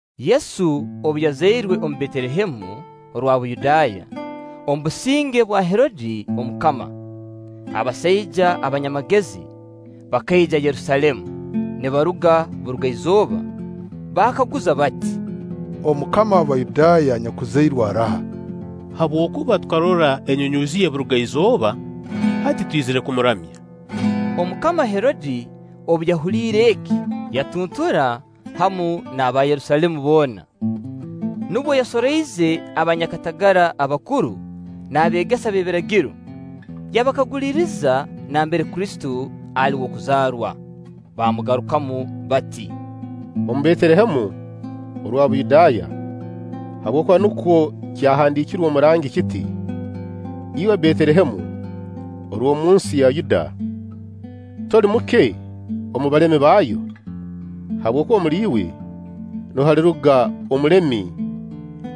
Yesu obu yazairwe omu Betelehemu orwa Buyudaaya, omu businge bwa Herode Omukama, abasaija abanyamagezi bakaija Yerusaalemu nibaruga Burugaizooba, baakaguza bati: “Omukama w'Abayudaaya anyakuzairwe araha? Habwokuba tukarora enyunyuuzi ye Burugaizooba, hati twizire kumuramya.” Omukama Herode obu yahuliire eki, yatuntura hamu n'aba Yerusaalemu boona. Nubwo yasoroize banyakatagara abakuru n'abeegesa b'ebiragiro yabakaguliriza nambere Kristo ali w'okuzaarwa. Baamugarukamu bati: “Omu Betelehemu orwa Buyudaaya; habwokuba nukwo kyahandiikirwe omurangi kiti: ‘Iwe Betelehemu orw'omu nsi ya Yuda, toli muke omu balemi baayo; habwokuba omuli iwe nuho haliruga omulemi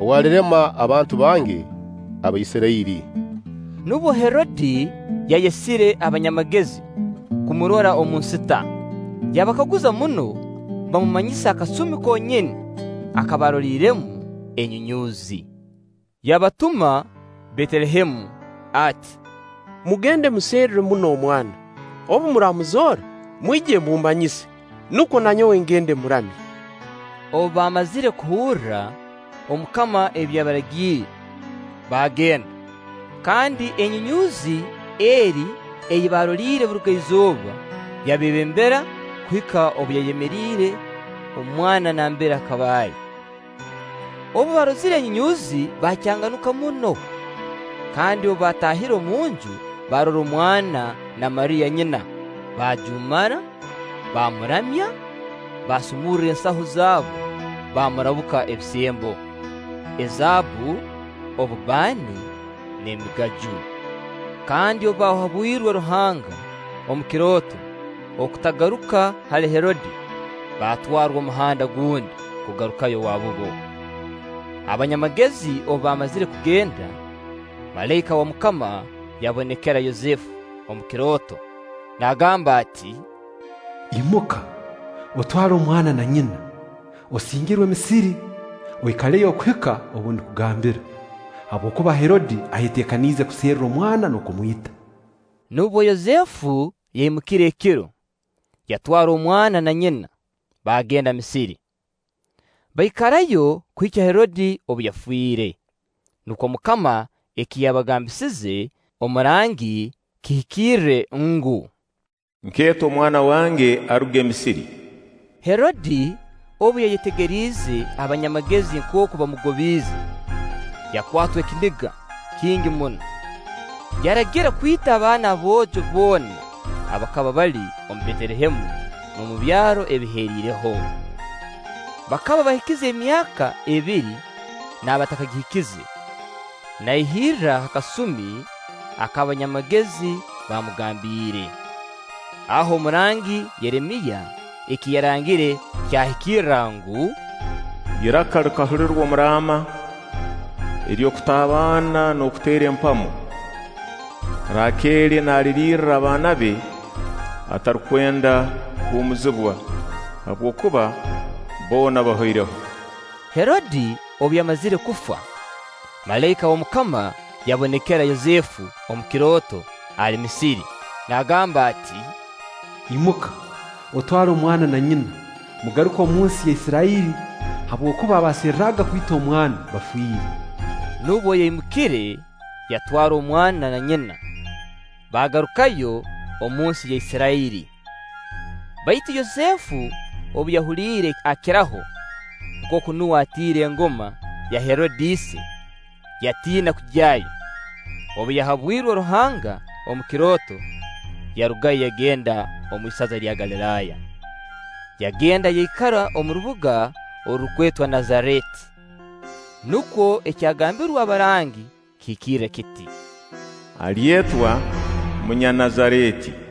ow'alirema abantu bange Abaisirairi’.” Nubwo Herode yayesire abanyamagezi kumurora omunsita, yabakaguza muno bamumanyise akasumi konyini aka baaroliiremu enyunyuuzi. Yabatuma Betelehemu ati: “Mugende muserre muno omwana, obu muraamuzoora, mwije mummanyise, nukwo na nyowe ngende mmuramye.” Obu baamazire kuhurra omukama ebi yabaragiire, baagenda; kandi enyunyuuzi eri ei baaroliire Burugaizooba yabeebembera kuhika obu yayemeriire omwana nambere akaba ali. Obu baarozire enyunyuuzi, baakyanganuka muno. Kandi obu baataahire omunju, baarora omwana na Mariya nyina, baajumara, baamuramya, baasumurra ensaho zaabo, baamurabuka ebisembo: ezaabbu, obubbani, n'emigaju. Kandi obu baahabwirwe Ruhanga omu kirooto okutagaruka hali Herode, bakatwarwa omuhanda gundi kugarukayo owabu bo. Abanyamagezi obu baamazire kugenda, malaika wa MUKAMA yabonekera Yosefu omu kirooto, naagamba ati: “Imuka, otwale omwana na nyina, osingirwe Misiri, oikaleyo okuhika obu ndikugambira; habwokuba Herode ayeteekaniize kuseera omwana n'okumwita.” Nubwo Yosefu yaimukire ekiro, yatwara omwana na nyina, baagenda Misiri; baikarayo kuhikya Herode obu yafiire. Nukwo MUKAMA eki yagambisize omurangi kihikirre ngu: “Nkeeta omwana wange aruge Misiri.” Herode obu yayetegeriize abanyamagezi nkooku baamugobiize, yakwatwa ekiniga kingi muno. Yaragira kwita abaana aboojo boona abakaba bali omu Betelehemu n'omu byaro ebiherraineho, abakaba bahikize emyaka ebiri n'abatakagihikize, naihirra ha kasumi abanyamagezi aka baamugambiire. Aho omurangi Yeremiya eki yarangire kyahikirra ngu: “Iraka likahulirwa omu Rama, ery'okutaabaana n'okuteera empamo; Rakeeli naalirirra abaana be, atarukwenda kuhuu muzibwa, habwokuba boona bahoireho.” Herode obu yamazire kufa, malaika wa MUKAMA yabonekera Yosefu omu kirooto ali Misiri, naagamba ati: “Imuka, otwale omwana na nyina, mugaruke omunsi ya Isirairi; habwokuba abaaserraga kwita omwana bafiire.” Nubwo yaimukire, yatwara omwana na nyina, baagarukayo omunsi ya Isirairi. Baitu Yosefu obu yahuliire Akiraho nkooku nuwe atiire engoma ya Herode ise, yatiina kugyayo. Obu yahabwirwe Ruhanga omu kirooto, yarugayo yagenda omu isaza lya Galiraaya. Yagenda yaikara omu rubuga orurukwetwa Nazareeti, nukwo ekyagambirwe abarangi kihikirre kiti: “Alyetwa Munyanazareeti.”